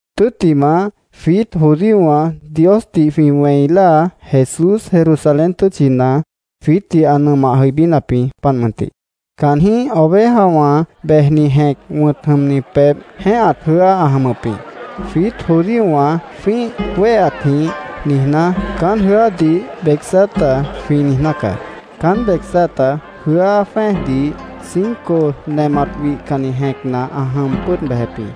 Tʉ́ttimah, jwiít judíowã Diosdih jwĩ wẽi láa Jesús Jerusalén tʉ́tchina jwiítdih ã nʉmah jʉibínap jĩ, páant mʉntih. Caanjĩ́h Ovejawã Bejni Jẽc wʉ̃t jʉmni pebh jẽ́ehat jʉ́á ã jʉmʉp jĩ. Jwiít judíowã jwĩ́ih wéheatjĩh niijná, caán jʉ́ádih Betzata jwĩ niijná caá. Caán Betzata jʉ́á jwẽ́ejdih cinco nemat wihcanni jẽcna ã jʉm pʉ́ʉd bejep jĩ.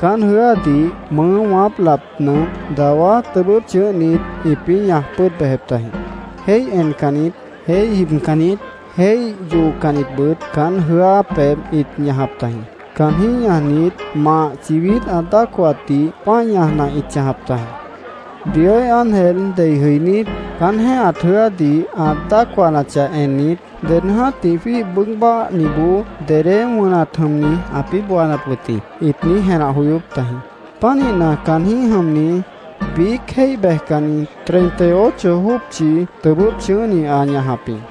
Caán jʉ́ádih mʉʉ́ wãáp lap nʉmp dawá tʉbʉ́p chʉ̃ʉ́hnit ĩpĩ́ ñaj pʉ́ʉd bejep tajĩ. Jéih encannit, jéih jibcannit, jéih yoocannitbʉt caán jʉ́á pebh ĩt ñajap tajĩ. Caanjĩ́h ñajnit, mah chibít ã dácohatdih pã́i ñajna ĩt chãjap tajĩ. “Dioíh ángel dei jʉinít, caán jẽ́ehat jʉ́ádih ã dácohanachah ennit, ded jã́tih jwíih bʉʉ́g báahniboó dedé wʉnat jʉmni ãpĩ́ boonap wʉt jĩ”, ĩt niíj jenah joyóp tajĩ. Pánihna, caanjĩ́h jʉmni biíc jéih bejcanni, treinta ocho jópchi tʉbʉ́p chʉ̃ʉ́hni ã ñajap jĩ.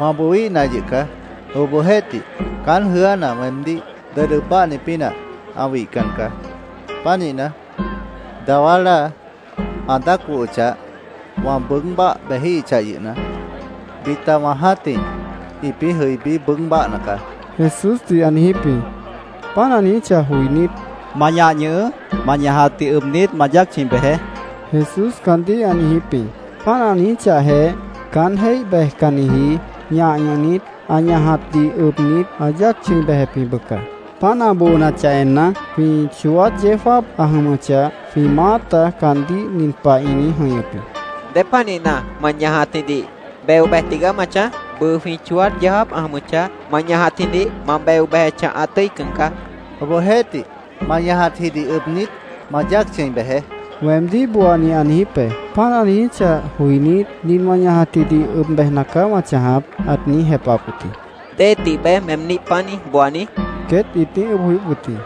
—Wã booíhna yʉh caá. Obohjeéhtih, can jʉ́ána weemdíh ded ʉb báahni pínah ã wihcan caá. Pánihna, dawá láa ã dácohochah, wã bʉʉ́g báah bejíhichah yʉhna, bita wã jã́tih ĩpĩ́ jʉibí bʉʉ́g báahna caá, Jesúsdih ã niijíp jĩ. Páant ã niijíchah joinít, —Ma ñah ñʉhʉʉ́. Ma ñajatdih ʉbnit, ma yáac chʉ̃i bejeé, Jesús caandíh ã niijíp jĩ. Páant ã niijíchahjeh, caán jéih bejcanniji ñah ñʉhnit, ã ñajatjidih ʉbnit, ã yáac chʉ̃i bejep jĩ, bʉca. Páant ã boonachah enna, jwĩ chooát yeó jáap ã jʉmʉchah, jwĩ maáta caandíh nin pah ĩt niíj jʉ̃ihñʉp wʉt jĩ: —¿Dépanihna, ma ñajatjidih beo bej tigaá ma chãj? Bʉʉ jwĩ chooát yeó jáap ã jʉmʉchah, ma ñajatjidih ma beo bejechah, ã tʉ́ican caá, ĩt niijíp wʉt jĩ. —Obohjeéhtih, ‘Ma ñajatjidih ʉbnit, ma yáac chʉ̃i bejeé’, weemdíh booani ã niijíp be. Páant ã niijíchah joinít, nin wã ñajatjidih ʉb bejna caá wã chãjap, ãt niíj jepahap wʉt jĩ. —¿Déhe tibeé meemdíh páant niíj, booani? queét ĩt niíj ʉʉ́bh joyóp wʉt jĩ.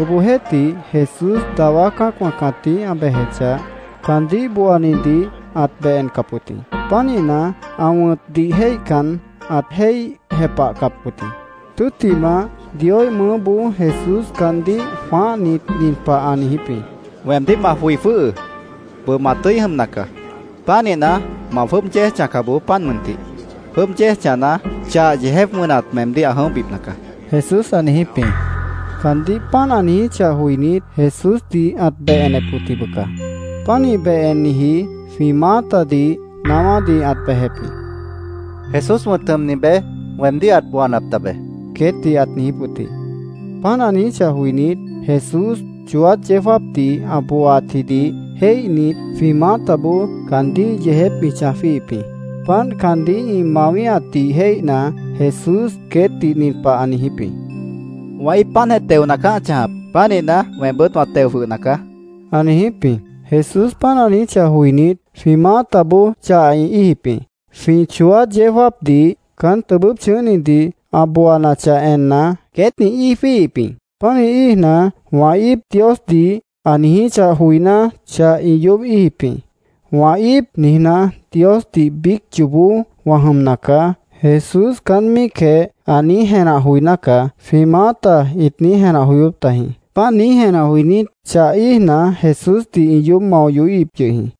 Obohjeéhtih, Jesús dawá cã́acwã cãtíh ã bejechah, caandíh booanidih ãt beh encap wʉt jĩ. Pánihna, ã wʉ̃tdih jéihcan, ãt jéih jepahcap wʉt jĩ. Tʉ́ttimah, Dioíh mʉʉ́boó Jesús caandíh jwãáhnit, nin pah ã niijíp jĩ: —Weemdíh ma joi jwʉ́hʉʉ́. Bʉʉ ma tʉ́i jʉmna caá. Pánihna, ma jwʉ́ʉb yéej chãjca bojoó, páant mʉntih. Jwʉ́ʉb yéej chãjna, chah yeejép wʉnat meemdíh ã jʉ̃óhbipna caá, Jesús ã niijíp jĩ. Caandíh páant ã niijíchah joinít, Jesúsdih ãt beh enep wʉt jĩ, bʉca. Pánih beh enniji jwĩ maátadih naáwádih ãt bejep jĩ. —Jesús wʉ̃t jʉmni beé weemdíh ãt booanap tabe, queétdih ãt niijíp wʉt jĩ. Páant ã niijíchah joinít, Jesús chooát yeó jáapdih ã booaatjidih jéihnit, jwĩ maátaboó caandíh yeejép ĩ chãj jwíihip jĩ. Páant caandíh ĩ mawíhatdih jéihna, Jesús queétdih nin pah ã niijíp jĩ: —Wã íip páantjeh teona caá ã chãjap. Pánihna, weembʉ́t wã teo jwʉhna caá, ã niijíp jĩ. Jesús páant ã niijíchah joinít, jwĩ maátaboó chah ĩ íijip jĩ. Jwĩ chooát yeó jáapdih caán tʉbʉ́p chʉ̃ʉ́hnidih ã booanachah enna, queét ĩ íij jwíihip jĩ. Pánih íijna, “Wã íip”, Diosdih ã niijíchah joiná, chah ĩ yoób íijip jĩ. “‘Wã íip’, niijná, ‘Diosdih biíc yoobó wã jʉmna caá’, Jesús caán míicjeh ã niíj jenah joiná caá”, jwĩ maáta ĩt niíj jenah joyóp tajĩ. Páant niíj jenah joinít, chah íijna, Jesúsdih ĩ yoób mao yohíhip yʉh jĩ.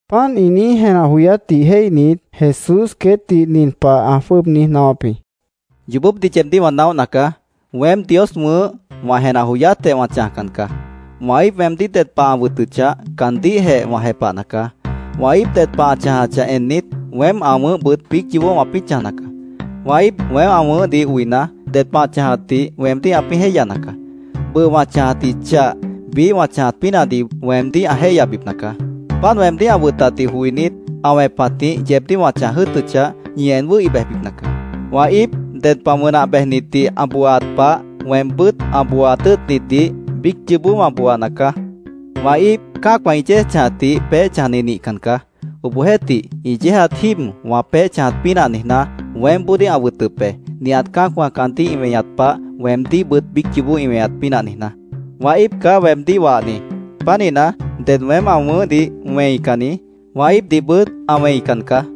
Páant ĩ niíj jenah joyátdih jéihnit, Jesús queétdih nin pah ã jwʉ́ʉb niíj naáwáp jĩ: “Yoobópdih yeebdíh wã naóhna caá. Weém, Dios wʉ̃ʉ́h, wã jenah joyátjeh wã chãjcan caá. Wã íip weemdíh ded pah ã wʉtʉchah, caandíhjeh wã jepahna caá. Wã íip ded pah ã chãjachah ennit, weém ã wʉ̃ʉ́hbʉt biíc yoobó wãpĩ́ chãjna caá. Wã íip weém ã wʉ̃ʉ́hdih oina, ded pah ã chãjatdih weemdíh ãpĩ́ jéihyana caá. Bʉʉ wã chãjatji chah, biíh wã chãjat pínahdih weemdíh ã jéihyabipna caá. Páant weemdíh ã wʉtatdih joinít, ã wẽpatjĩh yeebdíh wã chãj jʉ́ʉtʉchah, ñi en wʉ́hi bejbipna caá. Wã íip ded pah wʉnah bejnitdih ã booaat pah, weembʉ́t ã booaat tʉ́ʉtnitdih biíc yoobó wã booana caá. Wã íip cã́acwã ĩ yéej chãjatdih peéh chãjni nihcan caá. Obohjeéhtih, ĩ yéejat jíib wã peéh chãjat pínah niijná, weémboodíh ã wʉtʉp be, nihat cã́acwã caandíh ĩ weñat pah, weemdíhbʉt biíc yoobó ĩ weñat pínah niijná. Wã íip caá weemdíh wahni. Pánihna, ded weém ã wʉ̃ʉ́hdih wẽicanni, wã íipdihbʉt ã wẽican caá.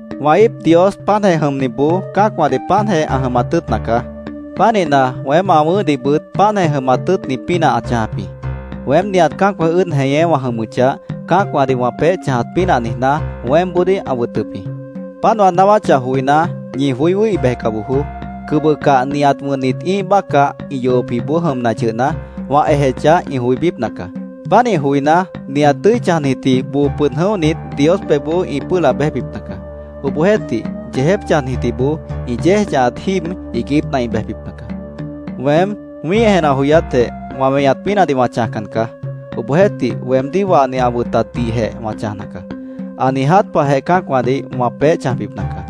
Wã íip Dios páantjeh jʉmniboó cã́acwãdih páantjeh ã jʉmat tʉ́ʉtna caá. Pánihna, weém ã wʉ̃ʉ́hdihbʉt páantjeh jʉmat tʉ́ʉtni pínah ã chãjap jĩ. Weém nihat cã́acwã ʉ́ʉd jeñé wã jʉmʉchah, cã́acwãdih wã peéh chãjat pínah niijná weémboodíh ã wʉtʉp jĩ. Páant wã naáwáchah joiná, ñi joí wʉ́hi bejca bojoó. Cʉbʉcah nihat wʉnnit ĩ́ih bácah ĩ yohopjiboó jʉmna yʉhna, wã ejechah, ĩ joibípna caá. Pánih joiná, nihat tʉ́i chãjnitji boo pʉd jʉ̃óhnit Dios pebhboó ĩ pʉ́ʉh laab béjbipna caá. Obohjeéhtih, yeejép chãjnitjiboó, ĩ yéej chãjatji jíib iiguípna ĩ bejbipna caá. “Weém wĩ́ih jenah joyátjeh, wã weñat pínahdih wã chãjcan caá. Obohjeéhtih, weemdíh wahni ã wʉtatdihjeh wã chãjna caá. Ã niiját pahjeh cã́acwãdih wã peéh chãjbipna caá.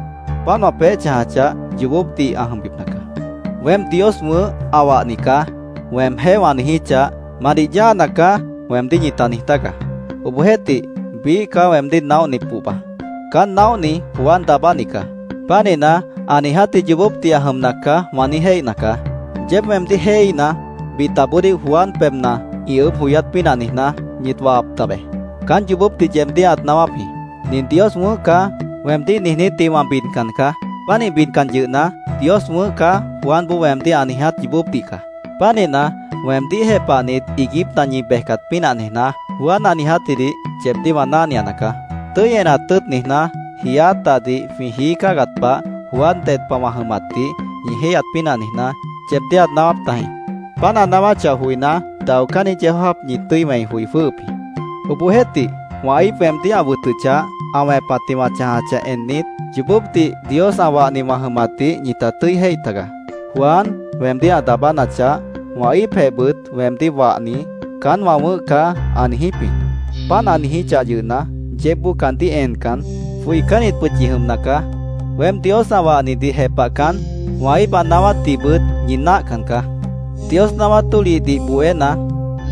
Páant wã peéh chãjachah, yoobópdih ã jʉmbipna caá. ‘Weém Dios wʉ̃ʉ́h, ã wahni caá’, weemjéh wã niijíchah, ‘Ma nih yáana caá’, weemdíh ñita niij tágaá. Obohjeéhtih, biíh caá weemdíh naóhni pohba. Caán naóhni Juan Daabáni caá. Pánihna, ‘Ã niijátji yoobópdih ã jʉmna caá’, wã niíj jéihna caá. Yeéb weemdíh jéihíhna, bitaboodíh Juan pebhna ĩ ʉʉ́bh joyát pínah niijná, ñit wahap tabe. Caán yoobópdih yeebdíh ãt naáwáp jĩ. ‘Nin Dios wʉ̃ʉ́h caá’, weemdíh niijnítdih wã bidcan caá. Pánih bidcan yʉhna, ‘Dios wʉ̃ʉ́h caá’, Juanboó weemdíh ã niiját yoobópdih caá. Pánihna, weemdíh jepahnit, iiguípna ñi bejcat pínah niijná, Juan ã niijátjidih yeebdíh wã náhniana caá. Tʉ́i enat tʉ́ʉt niijná, jiiát dahdih jwĩ jií cáagat pah, Juan ded pah wã jʉmatdih ñi jéihyat pínah niijná, yeebdíh ãt naáwáp tajĩ. Páant ã naáwáchah joiná, daocánni yeó jáap ñi tʉ́i wẽi joi jwʉ́hʉp jĩ. Obohjeéhtih, wã íip weemdíh ã wʉtʉchah, ã wẽpatjĩh wã chãjachah ennit, yoobópdih Dios ã wahni wã jʉmatdih ñita tʉ́i jéih tagaá. Juan weemdíh ã daabánachah, wã íipjehbʉt weemdíh wahni ‘Caán wã wʉ̃ʉ́h caá’, ã niijíp jĩ. Páant ã niijíchah yʉhna, yeébboó caandíh encan, joicánnitbʉt ñi jʉmna caá. Weém Dios ã wahnidih jepahcan, wã íip ã naáwátdihbʉt ñi náahcan caá. ‘Dios naáwát tólihdih bohéna,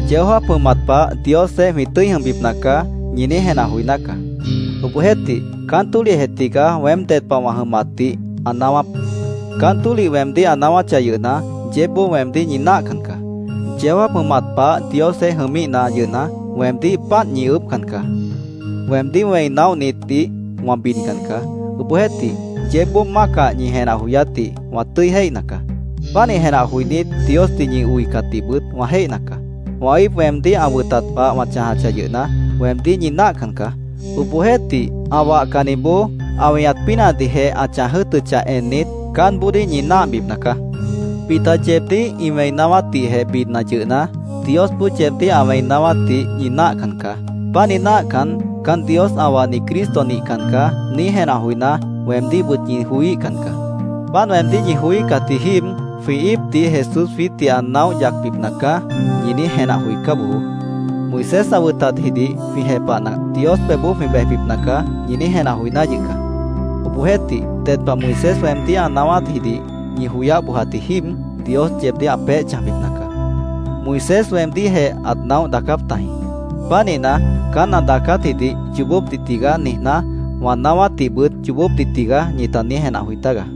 yeó jáap jʉmat pah Diosjeéh jwĩ tʉ́i jʉmbipna caá’, ñi niíj jenah joiná caá.Obohjeéhtih, caán tólihjeh tigaá weém ded pah wã jʉmatdih ã naáwáp. Caán tólih weemdíh ã naáwáchah yʉhna, yeébboó weemdíh ñi náahcan caá. Yeó jáap jʉmat pah Diosjeéh jʉmíhna yʉhna, weemdíh páant ñi ʉʉ́bhcan caá. “Weemdíh wẽi naóhnitdih wã bidcan caá. Obohjeéhtih, yeébboó mácah ñi jenah joyátdih wã tʉ́i jéihna caá. Pánih jenah joinít, Diosdih ñi oicatdihbʉt wã jéihna caá. Wã íip weemdíh ã wʉtat pah wã chãjachah yʉhna, weemdíh ñi náahcan caá. Obohjeéhtih, ã wahcanniboó ã weñat pínahdihjeh ã chãj jʉ́ʉtʉchah ennit, caánboodíh ñi náahbipna caá. Bita yeebdíh ĩ wẽi naáwátdihjeh bidna yʉhna, Diosboó yeebdíh ã wẽi naáwátdih ñi náahcan caá. Pánih náahcan, ‘Caán Dios ã wahni Cristo nihcan caá’, niíj jenah joiná, weemdíhbʉt ñi joííhcan caá. Páant weemdíh ñi joííhcatji jíib ‘Jwĩ íipdih Jesús jwiítdih ã naóh yacbipna caá’, ñi niíj jenah joicá bojoó. ‘Moisés ã wʉtatjidih jwĩ jepahna, Dios pebhboó jwĩ bejbipna caá’, ñi niíj jenah joiná yʉh caá. Obohjeéhtih, ded pah Moisés weemdíh ã naáwátjidih ñi joyáh bojat jíib, Dios yeebdíh ã peéh chãjbipna caá. Moisés weemdíhjeh ãt naóh daacáp tajĩ. Pánihna, caán ã daacátjidih ‘Yoobópdih tigaá’, niijná, wã naáwátdihbʉt ‘Yoobópdih tigaá’, ñita niíj jenah joi tágaá.